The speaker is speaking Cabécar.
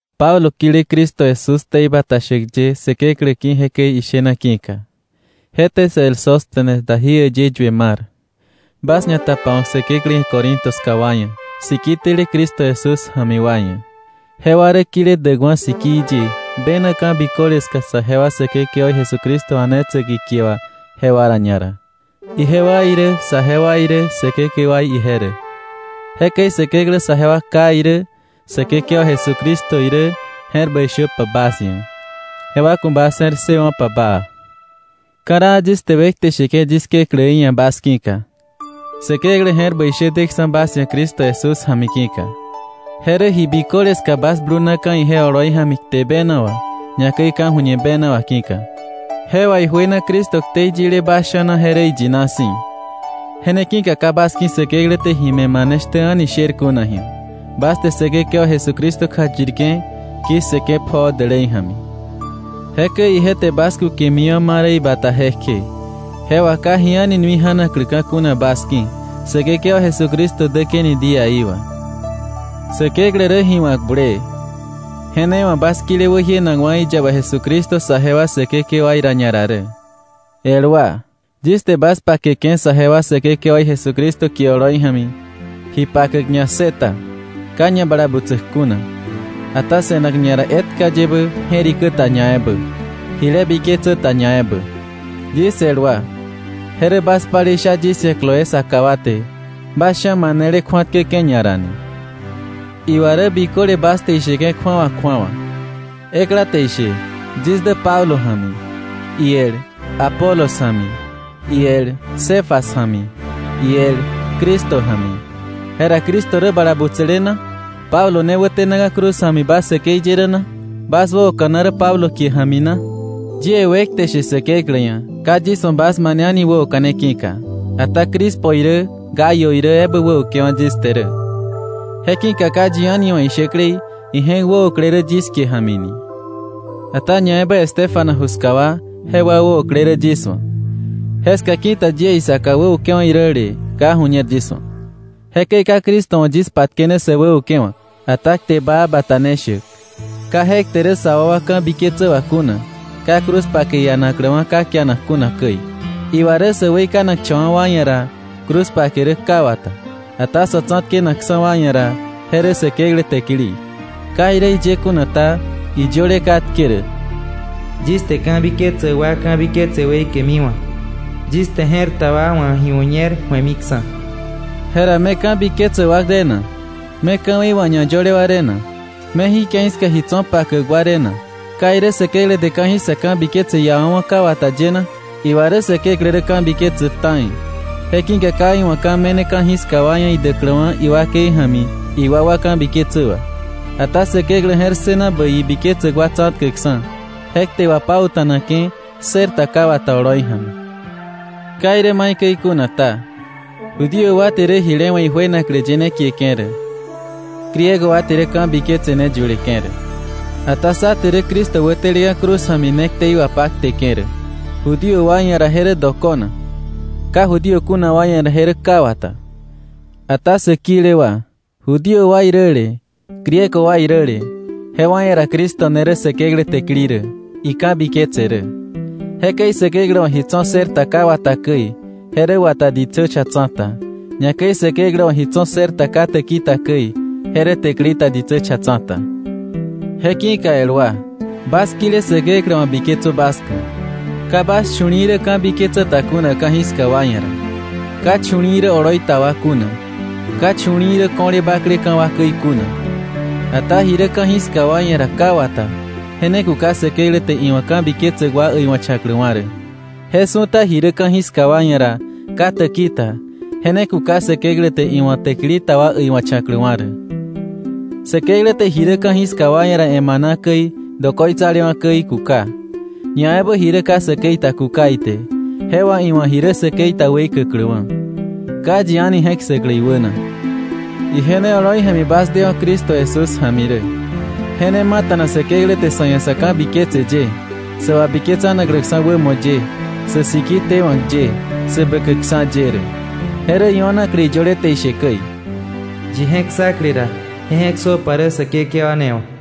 Pablo kile Cristo Jesús ktei bata shäk ye Säkeklä ki̱ jekäi ishena ki̱ka, je te sä el Sóstenes da jí äyë yue mar, bas ñatapawa̱k Säkeklä ia̱ Corinto ska wa ia̱, siki tele Cristo Jesús ja̱mi wa ia̱. Jewa rä kile däkwa̱ sikii ye, bena ka̱ biköle ska saje wa Säkekewaí Jesucristo a̱netsäk ikie wà, jewa ra ñara. Ijewa irä saje wa irä Säkekewaí ije rä. Jekäi Säkeklä saje wa Ká irä Säkekewa Jesucristo irä je̱r bäi shöpa bas ia̱, jewa ku̱ bas je̱r ssëwo̱pa baa. Ka̱raa yis te wekte sheke̱ yis Kekläí ia̱ bas ki̱ka, Säkeklä je̱r bäi shä deksa̱ bas ia̱ Cristo Jesús ja̱mi ki̱ka. Je rä ji biköle ska bas blunaka̱ ije oloi ja̱mi kte bena wà, ñakäi ka̱ju̱ñe bena wà ki̱ka. Je wà ijuena Cristo ktei yile bas sha̱na je rä iyina si̱. Je ne ki̱ka ka bas ki̱ Säkeklä te ji me̱ mane shtä a̱ni sher kuna ji̱a, bas te Säkekewa Jesucristo kjayirke̱ ki̱ssëke̱ pjoo dälei ja̱mi. Jekäi ije te bas kukemiwa̱ ma rä ibata jekje, je wà ka ji a̱ni nui ja̱nakläka̱ kuna bas ki̱ Säkekewa Jesucristo däke̱ni día í wà. Säkeklä rä ji wa̱k bulee. Je ne wa̱ bas kile wäjienakwa̱ iyaba Jesucristo saje wa Säkekewaí ra ñara rä. El wa, yis te bas pakeke̱ saje wa Säkekewa í Jesucristo kie oloi ja̱mi, ji pakäk ñassëta, ka ñabalabutsäk kuna, ata se̱nak ñara etka yebä je̱rikä ta ñaebä, jile biketsä ta ñaebä. Yis el wa, je rä bas palei sha yis ia̱ Cloé saka wa te, bas sha̱ manele kju̱atkäke̱ ñara ni. Iwa rä biköle bas te isheke̱ kju̱awa kju̱awa. Ekla te ishe “Yis dä Pablo ja̱mi,” iel, “Apolos ja̱mi,” iel, “Cefas ja̱mi,” iel, “Cristo ja̱mi.” Jera ¿Cristo rä bala butsäle na? ¿Pablo ne wätenaka̱ cruz ja̱mi bas säkei ye rä na? ¿Bas wäoka̱na rä Pablo kie ja̱mi na? Yie wekte sheke̱ Säkeklä ia̱, ka yis wa̱ bas mane a̱ni wäoka̱ne ki̱ka, ata Crispo irä Gayo irä ebä wäukewa̱ yis te rä. Je ki̱ka ka yi a̱ni wa̱ ishäklei ije̱k wäokle rä yis kie ja̱mi ni. Ata ñaebä Estéfanas ju ska wa, jewa wäokle rä yis wa̱. Jeska ki̱ta yie isaka wäukewa̱ iräle ka ju̱ñer yis wa̱. Jekäi ka Cristo wa̱ yis patkene sä wäukewa̱k, ata kte baa bata ne shäk, ka je kte rä sa wakwa ka̱biketsä wà kuna, ka cruz pake ianakläwa̱ ka kianak kuna käi. Iwa rä sä weikanakcha̱wa̱ wa ia̱ ra, cruz pake rä ka wata, ata sa̱ tsa̱tkenakksa̱ wa ia̱ ra, je rä Säkeklä täkili. Ka irä jiye kuna ta, iyöle katke rä: “Yis te ka̱biketsäk wa ka̱biketse weikemiwa̱. Yis te je̱r ta wa wa̱ ji ju̱ñer ju̱emiksa̱.” Jera, ¿me ka̱biketsäk wa re na? ¿Me ka̱wei wà ñayöle wa re na? ¿Me jí ke̱i ska ji tso̱ pakäk wa re na? ¿Ka irä Säkeklä te ka̱jiska ka̱biketse iawa̱wa̱ ka wata ye na? Iwa rä Säkeklä rä ka̱biketsäk ta̱i, je ki̱ka ka iwa̱ ka̱ me̱ne ka̱jiska wa ia̱ idäkläwa̱ iwakei ja̱mi iwakwa ka̱biketsä wà, ata Säkeklä je̱r ssëna bäi ibiketsäk wa tsa̱tkäkksa̱ je kte wapauta̱nake̱ ssër ta ka wata oloi ja̱mi. Ka irä maikäi kuna ta, Judío wa te rä jile we̱ ijuenaklä ye ne kieke̱ rä, Griego wa te rä ka̱biketse ne yuleke̱ rä. Ata sá te rä Cristo wäteleka̱ cruz ja̱mi ne ktei wapakteke̱ rä. Judío wa ia̱ ra je rä dokona, ka Judío kuna wa ia̱ ra, je rä ka wata. Ata sä kile wa, Judío wa iräle Griego wa iräle, jewa ia̱ ra Cristo ne rä Säkeklä täkili rä, ika̱biketse rä. Jekäi Säkeklä wa̱ ji tso̱ ssër ta ka wata käi, je rä wata ditsä cha tsa̱ta. Ñakäi Säkeklä wa̱ ji tso̱ ssër ta ka täki ta käi, je rä täkili ta ditsä cha tsa̱ta. Je ki̱ka el wa, bas kile Säkeklä wa̱ biketsö bas ku̱. Ka bas chu̱li̱i̱ rä ka̱biketsä ta kuna ka̱jiska wa ia̱ ra, ka chu̱li̱i̱ rä oloi ta wa kuna, ka chu̱li̱i̱ rä ko̱le bakleka̱ wa käi kuna. Ata ji rä ka̱jiska wa ia̱ ra ka wata, je ne kuka Säkeklä te iwa̱ ka̱biketsäk wa äiwa̱cha̱kläwa̱ rä, je su̱ta ji rä ka̱jiska wa ia̱ ra ka täki ta, je ne kuka Säkeklä te iwa̱ täkili ta wa äiwa̱cha̱kläwa̱ rä. Säkeklä te ji rä ka̱jiska wa ia̱ ra emana käi dokoitsalewa̱ käi kuka, ñaebä ji rä ka säkei ta kuka ite, je wà iwa̱ ji rä säkei ta weikäkläwa̱, ka yi a̱ni je̱k ssäklä iwäna. Ije ne oloi ja̱mi bas dewa̱ Cristo Jesús ja̱mi rä. Je ne mata̱na Säkeklä te sa̱ ia̱ sa̱ ka̱biketse ye, sä wabiketsanakläksa̱ wämo ye, sä siki tewa̱k ye, sä bäkäkksa̱ ye rä. Je rä io̱naklä iyöle te ishe käi: “Yi je̱k ssakle ra, je je̱k ssöpa rä Säkekewa ne wà.”